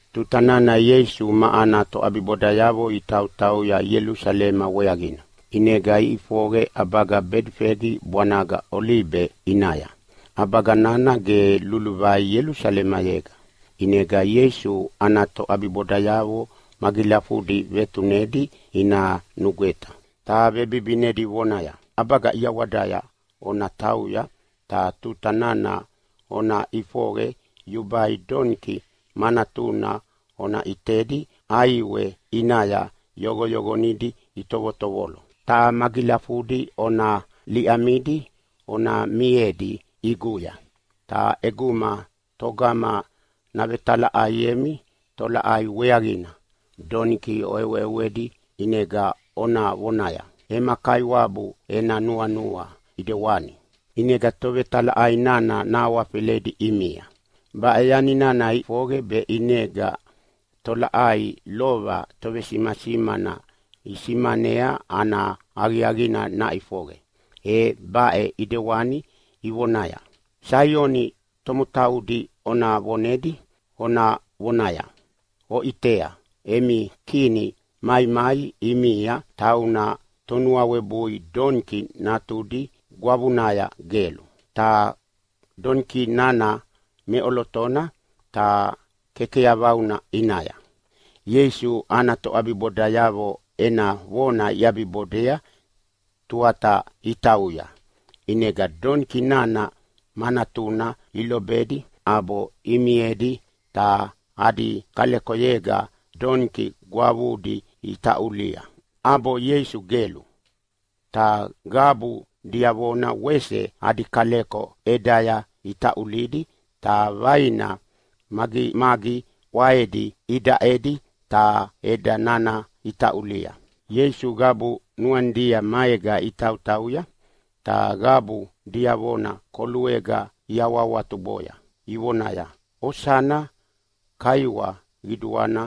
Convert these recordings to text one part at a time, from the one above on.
Tuta nana Ieisu ma ana toʼabibodayavo itautauya Ielusalema weaqina, ʼinega iʼifoqe ʼabaga Bedifegi bwanaga Olibe ʼinaya. ʼAbaga nana ge luluvai Ielusalemayega, ʼinega Ieisu ana toʼabibodayavo magilafudi vetunedi ina nugweta, ta vebibinedi vonaya, “ʼAbaga ʼiawadaya ona tauya, ta tuta nana ona ʼifoqe yubai doniki ma natuna ona ʼitedi ʼaiwe ʼinaya yoqoyoqonidi itovotovolo, ta magilafudi ona liʼemidi ona miedi ʼiguya. Ta ʼeguma togama navetalaʼaiemi tolaʼai weaqina doniki oʼeweʼewedi, ʼinega ona vonaya, ‘Ema Kaiwabu ena nuanua ʼidewani’, ʼinega tovetalaʼai nana nahawafeledi ʼimia.” Baʼe yani nana ʼifoqe be ʼinega tolaʼai lova tovesimasimana isimanea ana aqiaqina naʼifoqe, e baʼe ʼidewani ivonaya, “Saioni tomotaudi ona vonedi ona vonaya, ‘Oʼitea, emi Kini maimai ʼimia. Tauna tonuawebui doniki natudi gwavunaya gelu. Ta doniki nana meʼolotona ta kekeyavauna ʼinaya.’” Ieisu ana toʼabibodayavo ena vona iʼabibodea tuata itauya. ʼInega doniki nana ma natuna ilobedi ʼabo imiedi, ta adi kalekoyega doniki gwavudi itaʼuli, ʼabo Ieisu gelu. Ta qabu diavona wese adi kaleko ʼedaya itaʼulidi ta vaina magimagi ʼwaedi idaʼedi ta ʼeda nana itaʼulia. Ieisu qabu nuanidia maega itautauya, ta qabu diavona koluega iawahawatuboya ivonaya, “Osana! Kaiwa qiduana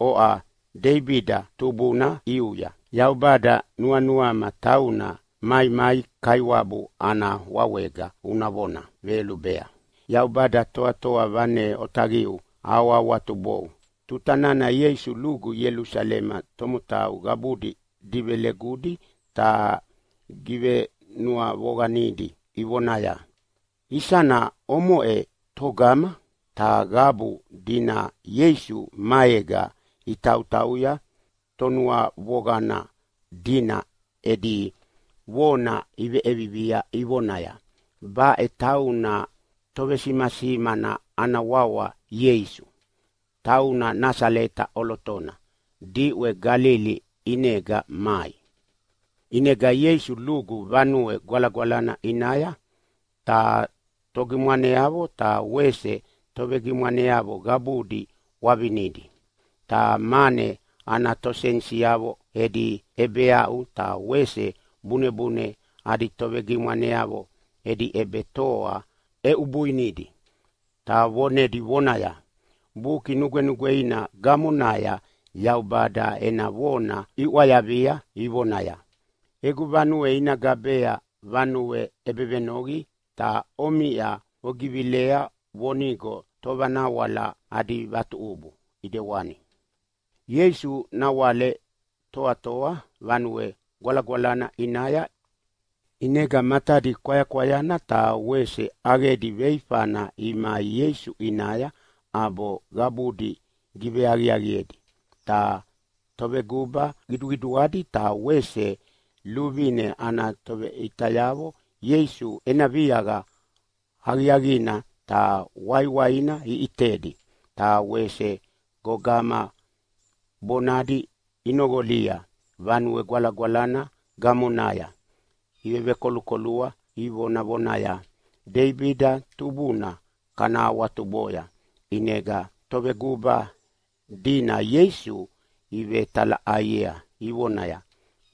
oʼa Deibida tubuna ʼiuya! Yaubada, nuanuama tauna maimai Kaiwabu ana wawega una vona veyolubea. Yaubada Toatoa Vane Otaqiu ahawahawatubou!” Tuta nana Ieisu lugu Ielusalema tomotau qabudi divelegudi ta givenuavoqanidi ivonaya, “Isana omoʼena togama?” Ta qabu dina Ieisu maega itautauya tonuavoqana dina edi vona iveʼevivia ivonaya, “Baʼe tauna tovesimasimana ana wawa Ieisu, tauna Nasaleta ʼolotona diʼwe Galili ʼinega mai.” ʼInega Ieisu lugu Vanue Gwalagwalana ʼinaya, ta togimwaneavo ta wese tovegimwaneavo qabudi ʼwavinidi. Ta mane ana tosenisiavo edi ʼebeaʼu ta wese bunebune adi tovegimwaneavo edi ʼebetoa ʼeʼubuinidi, ta vonedi vonaya, “Buki Nugwenugweina gamonaya Yaubada ena vona iʼwayavia vonaya, ‘Egu vanue ina gabea vanue ʼebevenoqi’, ta omiʼa ogivilea vonigo tovanawala adi vatuʼubu ʼidewani.” Ieisu nawale toatoa Vanue Gwalagwalana ʼinaya, ʼinega matadi kwayakwayana ta wese ʼaqedi veifana imai Ieisu ʼinaya ʼabo qabudi giveaqiaqiedi. Ta toveguba qiduqiduadi ta wese luvine ana toveʼitayavo Ieisu ena viaqa aqiaqina ta waiwaina iʼitedi, ta wese gogama bonadi inoqolia Vanue Gwalagwalana gamonaya ivevekolukolua, ivonavonaya, “Deibida tubuna kana awatuboya!” ʼInega toveguba dina Ieisu ivetalaʼaiea ivonaya,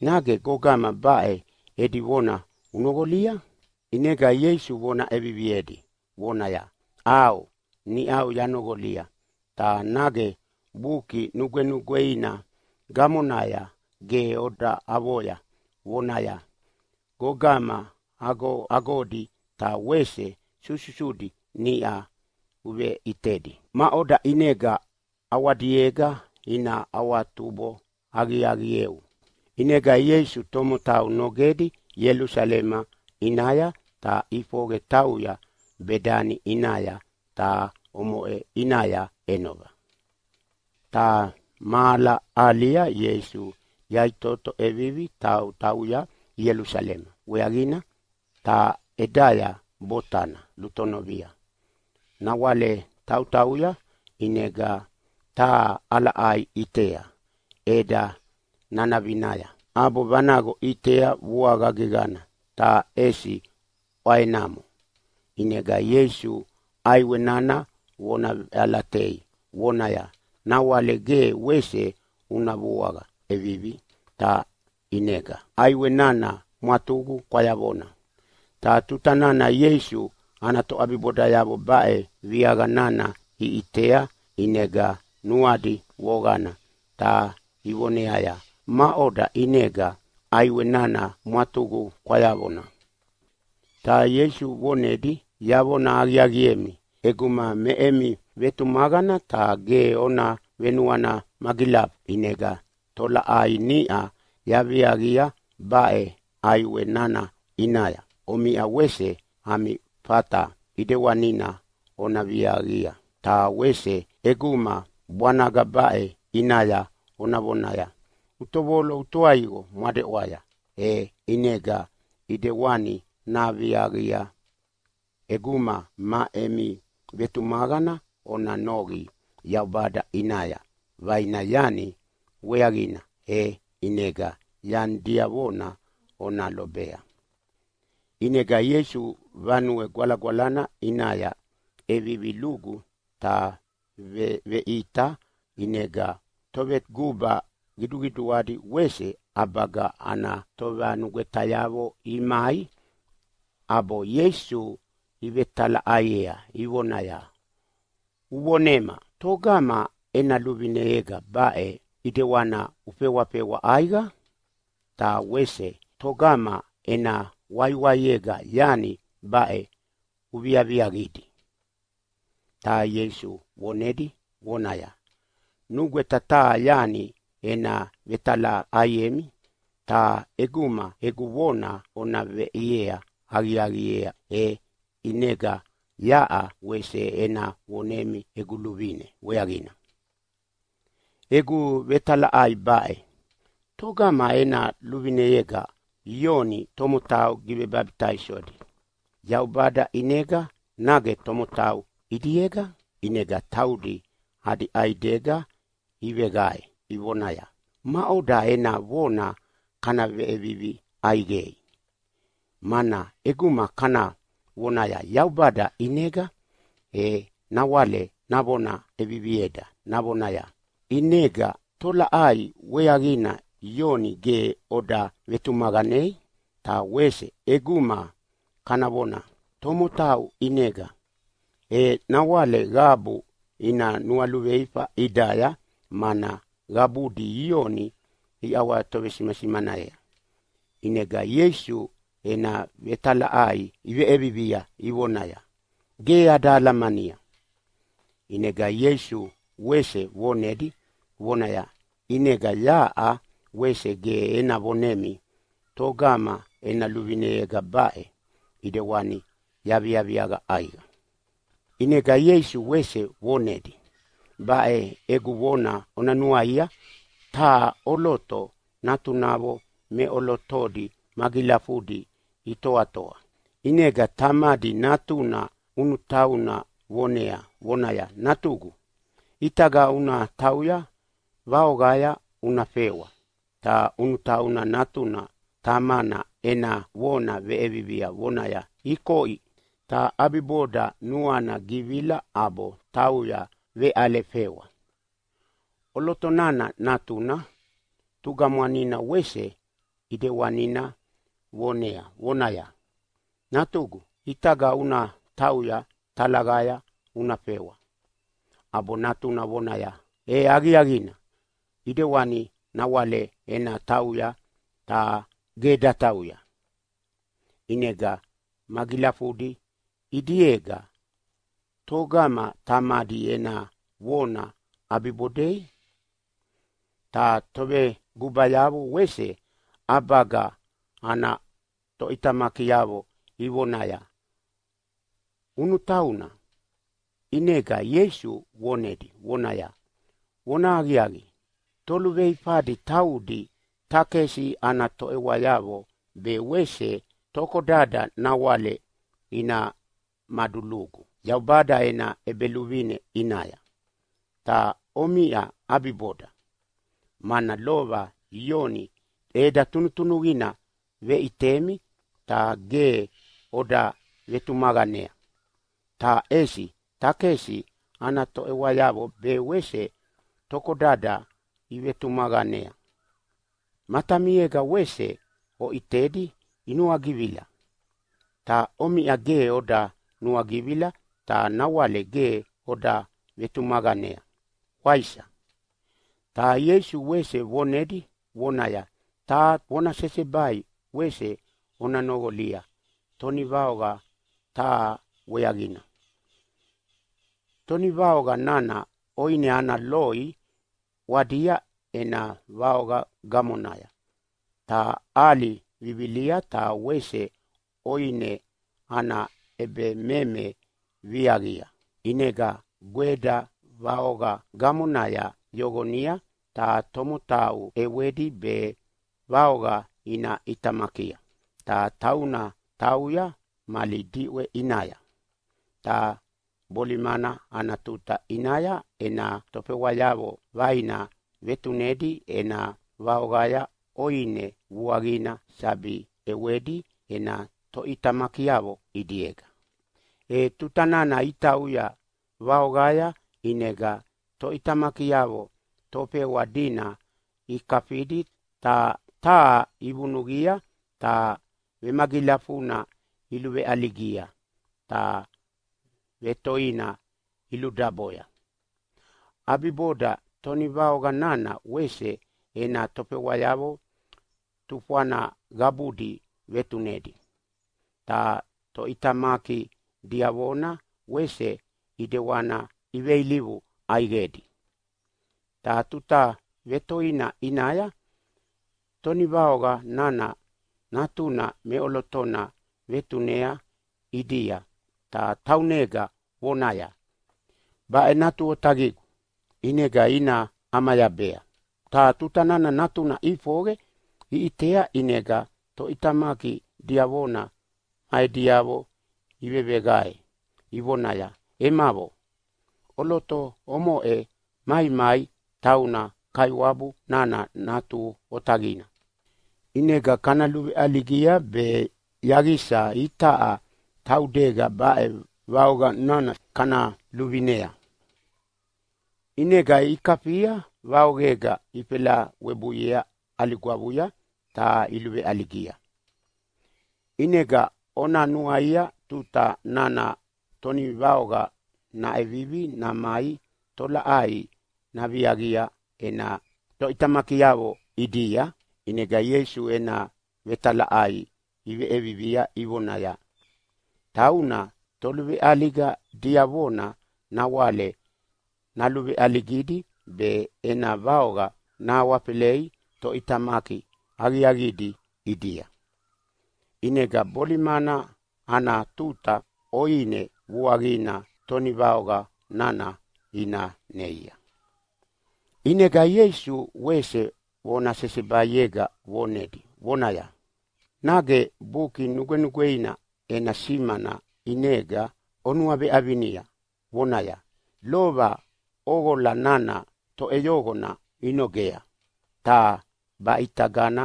“Nage gogama baʼe edi vona unoqolia?” ʼInega Ieisu vona ʼeviviedi vonaya, “ʼAo, niʼau yanoqolia, ta nage Buki Nugwenugweina gamonaya ge oda avoya vonaya, ‘Gogama agoagodi ta wese sususudi niʼa uveʼitedi maʼoda ʼinega ʼawadiega ina awatubo aqiaqieu.’” ʼInega Ieisu tomotau nogedi Ielusalema ʼinaya, ta ʼifoqe tauya Bedani ʼinaya, ta omoʼe ʼinaya ʼenova. Ta mahala ahalia Ieisu yaʼitoto ʼevivi tautauya Ielusalema weaqina, ta ʼedaya botana lutonovia. Nawale tautauya, ʼinega taha ʼalaʼai ʼitea ʼeda nanavinaya ʼabo vanaqo ʼitea vuaqa geqana, ta ʼesi ʼwaenamo. ʼInega Ieisu ʼaiwe nana vona veʼalatei vonaya, “Nawale ge wese una vuaqa ʼevivi!” Ta ʼinega ʼaiwe nana mwatuqu kwayavona. Ta tuta nana Ieisu ana toʼabibodayavo baʼe viaqa nana iʼitea ʼinega nuadi voqana ta ivoneaya, “Maʼoda ʼinega ʼaiwe nana mwatuqu kwayavona?” Ta Ieisu vonedi, “Yavona aqiaqiemi, ʼeguma me emi vetumaqana ta ge ona venuana magilafu, ʼinega tolaʼai niʼa yaviaqia baʼe ʼaiwe nana ʼinaya, omiʼa wese ami fata ʼidewanina ona viaqia. Ta wese ʼeguma bwanaga baʼe ʼinaya ona vonaya, ‘Utovolo utoaiqo mwadeʼwaya!’ e ʼinega ʼidewani naviaqia. ʼEguma me emi vetumaqana ona noqi Yaubada ʼinaya vaina yani weaqina, e ʼinega yani diavona ona lobea.” ʼInega Ieisu Vanue Gwalagwalana ʼinaya ʼevivi lugu ta veveʼita. ʼInega toveguba qiduqiduadi wese ʼabaga ana tovanugwetayavo imai ʼabo Ieisu ivetalaʼaiea ivonaya, “Uvonema togama ena luvineyega baʼe ʼidewana ufewafewa ʼaiqa? Ta wese togama ena waiwaiega yani baʼe uviaviaqidi?” Ta Ieisu vonedi vonaya, “Nugweta taha yani ena vetalaʼaiemi, ta ʼeguma egu vona ona veʼia aqiaqiea e ʼinega yaʼa wese ena vonemi egu luvine weaqina. Egu vetalaʼai baʼe, ‘Togama ena luvineyega Ioni tomotau givebabitaisodi, Yaubada ʼinega nage tomotau ʼidiega?’” ʼInega taudi adi ʼaidega iveqae ivonaya, “Maʼoda ena vona kana veʼevivi ʼaiqei? Mana ʼeguma kana vonaya ‘Yaubada ʼinega’, e nawale navona ʼevivieda navonaya, ‘ʼInega tolaʼai weaqina Ioni ge oda vetumaqanei?’ Ta wese ʼeguma kana vona, ‘Tomotau ʼinega’, e nawale qabu ina nualuveifa ʼidaya mana qabudi Ioni iʼawatovesimasimanea.” ʼInega Ieisu ena vetalaʼai iveʼevivia ivonaya, “Ge ada alamania.” ʼInega Ieisu wese vonedi vonaya, “ʼInega yaʼa wese ge ena vonemi togama ena luvineyega baʼe ʼidewani yaviaviaqa ʼaiqa.” ʼInega Ieisu wese vonedi, “Baʼe egu vona ona nuaia. Taha ʼoloto natunavo meʼolotodi magilafudi itoatoa. ʼInega tamadi natuna ʼunutauna vonea vonaya, ‘Natugu, ʼitaga una tauya vaoqaya una fewa’, “ta ʼunutau nana tamana ena vona veʼevivia vonaya, ‘Ikoʼi’, ta ʼabiboda nuana givila ʼabo tauya veʼale fewa. “ʼOloto nana natuna tugamwanina wese ʼidewanina vonea vonaya, ‘Natugu, ʼitaga una tauya talaqaya una fewa’, “ʼabo natuna vonaya, ‘E aqiaqina ʼidewani, nawale ena tauya’, ta ge datauya. “ʼInega magilafudi ʼidiega togama tamadi ena vona ʼabibodei?” Ta tovegubayavo wese ʼabaga ana toʼitamakiavo ivonaya, “ʼUnutauna”. ʼInega Ieisu vonedi vonaya, “Vonahaqiaqi, toluveifadi taudi takesi ana toʼewayavo be wese tokodada nawale ina madulugu Yaubada ena ʼEbeluvine ʼinaya, ta omiʼa ʼabiboda. Mana lova Ioni ʼeda tunutunuqina veʼitemi ta ge oda vetumaqanea, ta ʼesi takesi ana toʼewayavo be wese tokodada ivetumaqanea. Matamiega wese oʼitedi inuagivila, ta omiʼa ge oda nuagivila ta nawale ge oda vetumaqanea, waisa?” Ta Ieisu wese vonedi vonaya, “Taha vona sesebai wese ona noqolia tonivaoqa taha weaqina. Tonivaoqa nana ʼoine ana loi ʼwadia ena vaoqa gamonaya, ta ʼali vivilia ta wese ʼoine ana ʼebememe viaqia. ʼInega gweda vaoqa gamonaya yoqonia ta tomotau ʼewedi be vaoqa ina ʼitamakia, ta tauna tauya mali diʼwe ʼinaya. Ta bolimana ana tuta ʼinaya ena tofewayavo vaina vetunedi ena vaoqaya ʼoine vuaqina sabi ʼewadi ena toʼitamakiavo ʼidiega. “E tuta nana itauya vaoqaya ʼinega toʼitamakiavo tofewa dina ikafidi, ta taha ivunuqia ta vemagilafuna iluveʼaligia ta vetoina iludaboya. ʼAbiboda tonivaoqa nana wese ena tofewayavo tufwana qabudi vetunedi, ta toʼitamaki diavona wese ʼidewana iveilivu ʼaiqedi. Ta tuta vetoina ʼinaya tonivaoqa nana natuna meʼolotona vetunea ʼidia ta taunega vonaya, ‘Baʼe natu otaqigu, ʼinega ina ʼamayabea.’ “Ta tuta nana natuna ʼifoqe iʼitea ʼinega toʼitamaki diavona ma ediavo iveveqae ivonaya, ‘Emavo, ʼoloto omoʼe maimai tauna kaiwabu nana natu otaqina, ʼinega kana luveʼaligia be yaqisa itaʼa taudega baʼe vaoqa nana kana luvinea.’ ʼInega ikafia vaoqega ifelawebuiea ʼali gwavunaya ta iluveʼaligia. “ʼInega ona nuaia tuta nana tonivaoqa naʼevivi namai tolaʼai naviaqi ena toʼitamakiavo ʼidia?” ʼInega Ieisu ena vetalaʼai iveʼevivia ivonaya, “Tauna toluveʼaliga diavona nawale naluveʼaligidi be ena vaoqa nahawafelei toʼitamaki aqiaqidi ʼidia, ʼinega bolimana ana tuta ʼoine vuaqina tonivaoqa nana ina neia.” ʼInega Ieisu wese vona sesebaiega vonedi vonaya, “Nage Buki Nugwenugweina ena simana ʼinega onuaveʼavinia vonaya, ‘Lova ʼoqola nana toʼeyoqona inogea, ta baʼitagana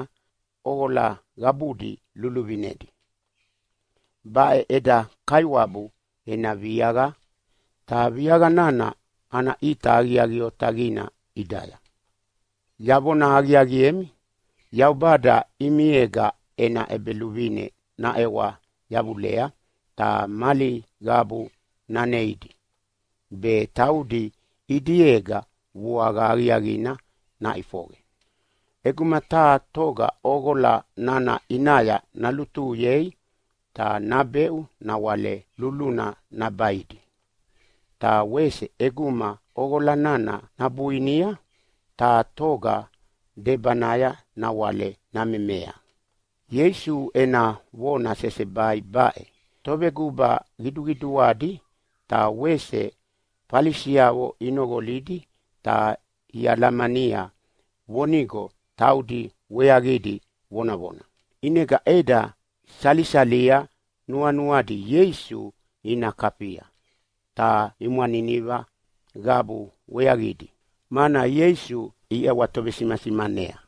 ʼoqola qabudi luviluvinedi. Baʼe eda Kaiwabu ena viaqa, ta viaqa nana ana ʼita aqiaqi otaqina ʼidaya.’ “Yavona aqiaqiemi, Yaubada ʼimiega ena ʼEbeluvine naʼewa yavulea ta mali qabu naneidi, be taudi ʼidiega vuaqa aqiaqina naʼifoqe. ʼEguma taha toga ʼoqola nana ʼinaya nalutuhuyei ta nabeʼu nawale luluna nabaidi, ta wese ʼeguma ʼoqola nana nabuinia taha toga debanaya nawale namemea.” Ieisu ena vona sesebai baʼe toveguba qiduqiduadi ta wese Falisiavo inoqolidi ta ialamania vonigo taudi weaqidi vonavona. ʼInega ʼeda isalia nuanuadi Ieisu ina kafia, ta imwaniniva qabu weaqidi, mana Ieisu iʼawatovesimasimanea.